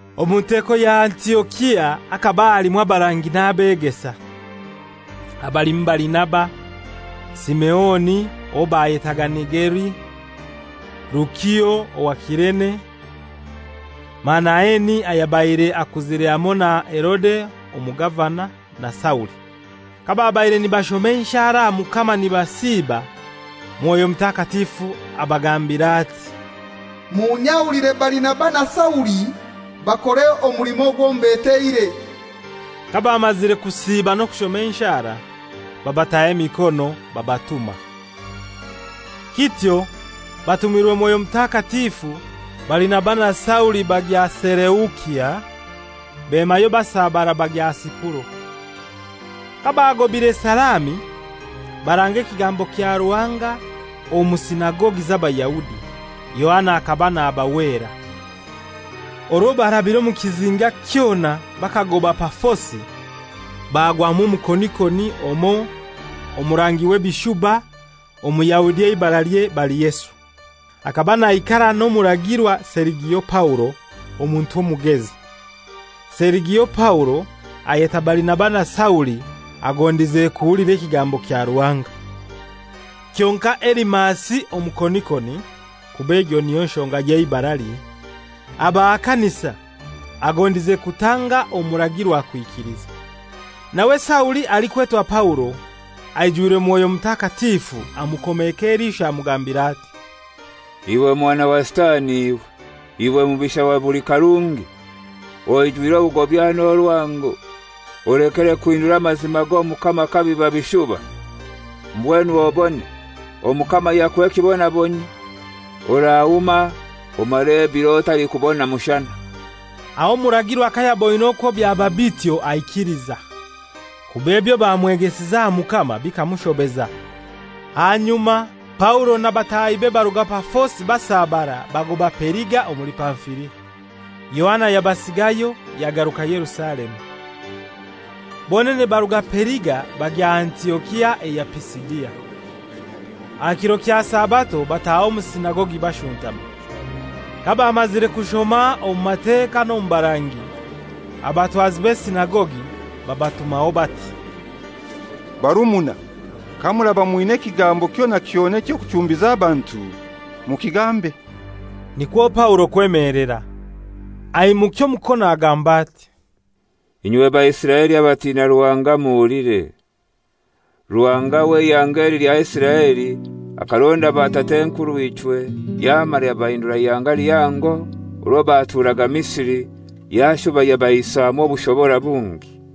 Omu nteko ya Antiokia hakaba halimu abarangi n'abegesa: abalimu Barinaba, Simeoni owo bayetaaga Nigeri, Lukio owa Kirene, Manaeni ayabaire akuzire hamoi na Herode omugavana, na Sauli. Kababaire nibashoma enshara aha Mukama nibasiba, Mwoyo Mutakatifu abagambira ati, «Munyahulire Barinaba na Sauli bakore omulimo ogwo mbeteire.» Kabamazire kusiiba n'okushoma enshara, babataho emikono babatuma. Kityo batumirwe Mwoyo Mutakatifu Barinaba na Sauli bagya Selusia; bemayo basabara bagya Sipuro. Kabaagobaire Salami, baranga ekigambo kya Ruhanga omu sinagogi z'Abayahudi. Yohana akaba nabahwera. Orwo barabire omu kizinga kyona bakagoba Pafosi, bagwamu omukonikoni omoi omurangi w'ebishuba Omuyahudi eibaralye Bariyesu. Akaba naikara n'omuragirwa Serigio Paulo, omuntu omugezi. Serigio Paulo ayeta Barinaba na Sauli agondize kuhulira ekigambo kya Ruhanga. Kyonkai Elimasi omukonikoni (kuba egyo niyo nshonga y'eibaralye) abahakanisa, agondize kutanga omuragirwa kwikiliza. Nawe Sauli, alikwetwa Paulo, aijwirwe Mwoyo Mutakatifu amukomeeka eliisho amugambira ati, «Iwe mwana wa Sitani iwe, iwe mubisha wa buli karungi, oijwire obugobya n'orwango, olekere kuhindura amazima g'Omukama kabiba bishuba. Mbwenu obone, Omukama yakuha ekibonabonyio: Orahuma, omare ebiro otalikubona mushana.» Aho omuragirwa kayaboine okwo byaba bityo aikiliza, kuba ebyo bamwegesize aha Mukama bikamushobeza. Ahanyuma Paulo na batahibe baruga Pafosi basabara bagoba Periga omuli Pamfilia. Yohana yabasigayo yagaruka Yerusalemu. Bonene baruga Periga bagya Antiokia eya Pisidia. Aha kiro kya Sabato bataha omu sinagogi bashuntama. Kabamazire kushoma omu Mateka n'omu Barangi, abatwazi b'esinagogi babatumaho bati, «Barumuna, kamuraba mwina ekigambo kyona kyona eky'okuchumbiza abantu, mukigambe. Nikwo Paulo kwemelera, aimukya omukono agamba ati, «Inywe Baisiraeli abatina Ruhanga muhulire. Ruhanga w'eihanga eli lya Isiraeli akaronda batat'enkurw'ichwe, yamara yabahindura ihanga lihango orwo baturaga Misiri, yashuba yabaihisamu obushobora bungi.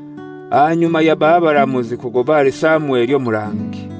Ahanyuma yabaha abaramuzi kugoba ahali Samweli omurangi.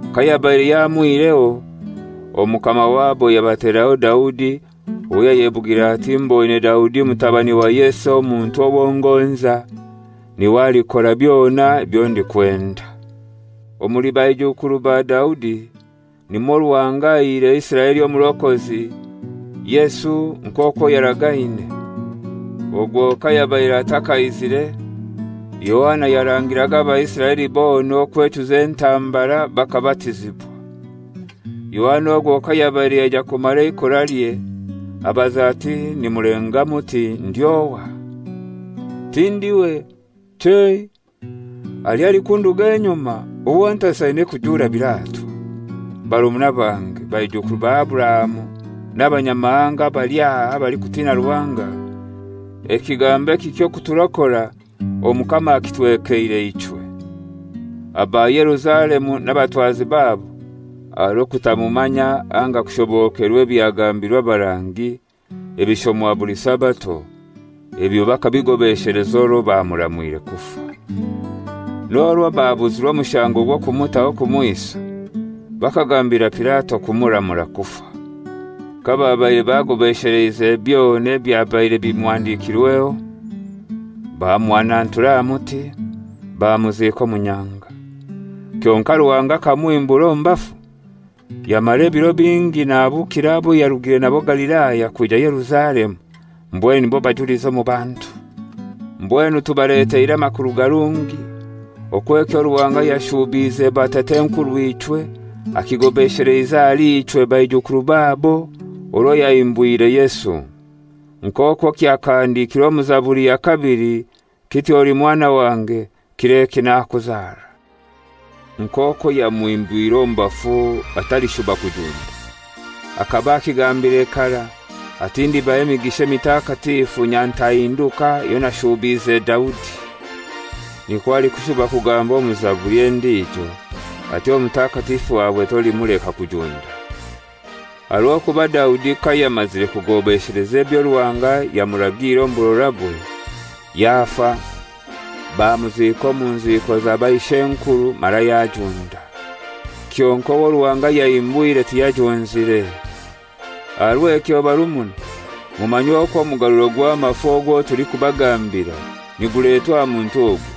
Kayabaire yamwihireho, omukama wabo yabateraho Daudi owo yayebugire ati, ‹Mboine Daudi mutabani wa Yese omuntu owo ngonza, n'iwe alikora byona ebyo ndikwenda.› Omuli baijukuru ba Daudi nimwo Ruhanga aihire Isiraeli omurokozi, Yesu, nk'okwo yaragaine. Ogwo kayabaire atakaizire Yohana yarangiraga Abaisiraeli bona okwechuza entambara bakabatizibwa. Yohana ogwo kayabaire yaija kumara eikoralye abaza ati, ‹Nimulenga muti ndi ohai? Tindiwe. Chei, haliyo alikunduga enyuma, owo ntasaine kujura biratwa.› «Barumuna bange, baijukuru ba Aburahamu n'Abanyamahanga abali aha abalikutina Ruhanga, ekigambo eki ky'okuturokora Omukama akitwekeire ichwe. Aba Yerusalemu n'abatwazi babo, aha rw'okutamumanya anga kushobokerwa ebyabagambirwe abarangi ebishomwa buli Sabato, ebyo bakabigobesheleza orwo bamuramwire kufa. N'orwo babuzirwe omushango gw'okumutaho kumwisa, bakagambira Pilato kumuramura kufa. Kababaire bagobaesheleize byona ebyabaire bimuhandikirweho, bamuhanantura aha muti, bamuziika omu nyanga. Kyonkai Ruhanga akamuhimbura omu bafu; yamara ebiro bingi nahabukira abo yarugire nabo Galilaya kwija Yerusalemu, mbwenu nibo bajulizi omu bantu. Mbwenu tubaleteire amakuru garungi okwo ekyo Ruhanga yashuubiize batat'enkurw'ichwe akigobesheleize ahali ichwe baijukuru babo orwo yahimbwire Yesu. Nk'okwo kyakahandikirwe omu Zaburi ya kabili kiti, ‹Oli mwana wange, kir'eki nakuzara.› Nk'okwo yamuhimbwire omu bafu atalishuba kujunda, akaba akigambire karai ati, ‹Ndibaha emigisha emitakatifu, nyatahinduka eyo nashuubiize Daudi.› Nikwo alikushuba kugamba omu Zaburi endijo ati, ‹Omutakatifu wawe tolimuleka kujunda.› «Aha rw'okuba Daudi kayamazire kugobesheleza ebyo Ruhanga yamuragiire omu burorabwe, yafa, bamuziika omu nziiko za baishenkuru mara yajunda. Kyonkai owo Ruhanga yahimbwire tiyajunzire. Aha rw'ekyo barumuna mumanye okwo omugaruliro gw'amafu ogwo tulikubagambira niguletwa aha muntu ogu.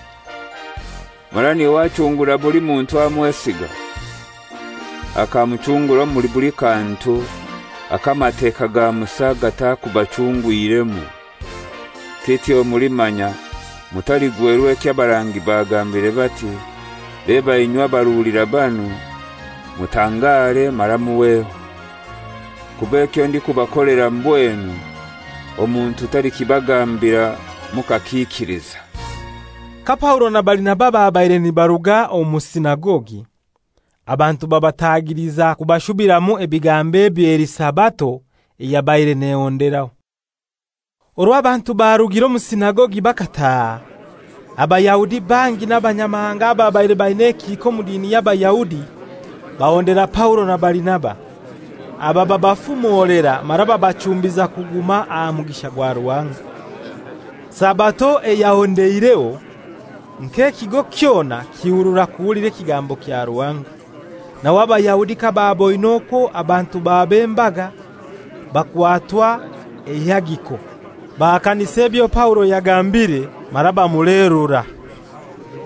Mara n'iwe achungura buli muntu amwesiga, akamuchungura omuli buli kantu ako Amateka ga Musa gatakubachungwiremu. Kityo mulimanya mutaligwerwa ekyo abarangi bagambire bati, ‹Leba inywe abaruulira banu, mutangare mara muhweho; kuba ekyo ndikubakolera mbwenu, omuntu talikibagambira mukakiikiliza.›» Ka Paulo na Barinaba babaire nibaruga omu sinagogi, abantu babatagiliza kubashubiramu ebigambo ebyo eli Sabato eyabaire nehonderaho. Orwo abantu barugire omu sinagogi bakataha, Abayahudi bangi n'Abanyamahanga ababaire baina ekihika omu dini y'Abayahudi bahondera Paulo na Barinaba, aba babafumolera mara babachumbiza kuguma aha mugisha gwa Ruhanga. Sabato eyahondeireho, nk'ekigo kyona kihurura kuhulira ekigambo kya Ruhanga. Nawe Abayahudi kababoine okwo abantu baba embaga bakwatwa eihagiko, bahakanisa ebyo Paulo yagambire mara bamuleerura.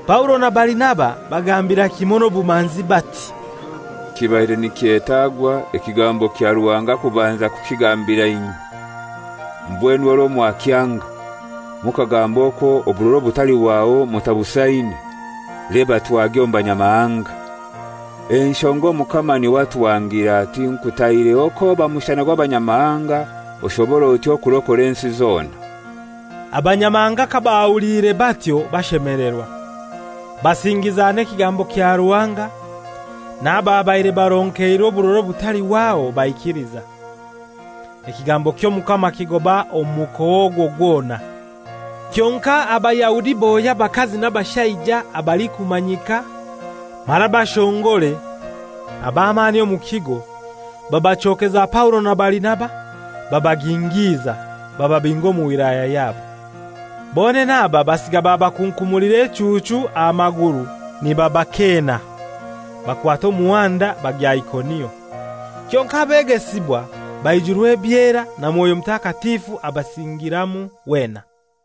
Paulo na Barinaba bagambira kimoi n'obumanzi bati, «Kibaire nikyetagwa ekigambo kya Ruhanga kubanza kukigambira inywe. Mbwenu orwo mwakyanga, mukagamba okwo oburora obutalihwaho mutabusaine, leba twagya omu Banyamahanga. Enshonga Omukama n'iwe atuhangiire ati, ‹Nkutaireho k'oba mushana gw'Abanyamahanga, oshobore otyo kurokora ensi zona.›» Abanyamahanga kabahuliire batyo bashemelerwa, basingiza n'ekigambo kya Ruhanga; n'ababaire baronkeirwe oburora obutalihwaho baikiliza. Ekigambo ky'Omukama kigoba omu mukoa ogwo gwona. Kyonkai Abayahudi bohya abakazi n'abashaija abalikumanyika mara abashongore ab'amani omu kigo, babachokeza Paulo na Barinaba babagingiza, bababinga omu wilaya yabo. Bonene aba basiga babakunkumulira echuuchu aha maguru nibabakeena, bakwata omuhanda bagya Ikonio. Kyonkai abegesibwa baijurwa ebyera, na Mwoyo Mutakatifu abasingiramu wena.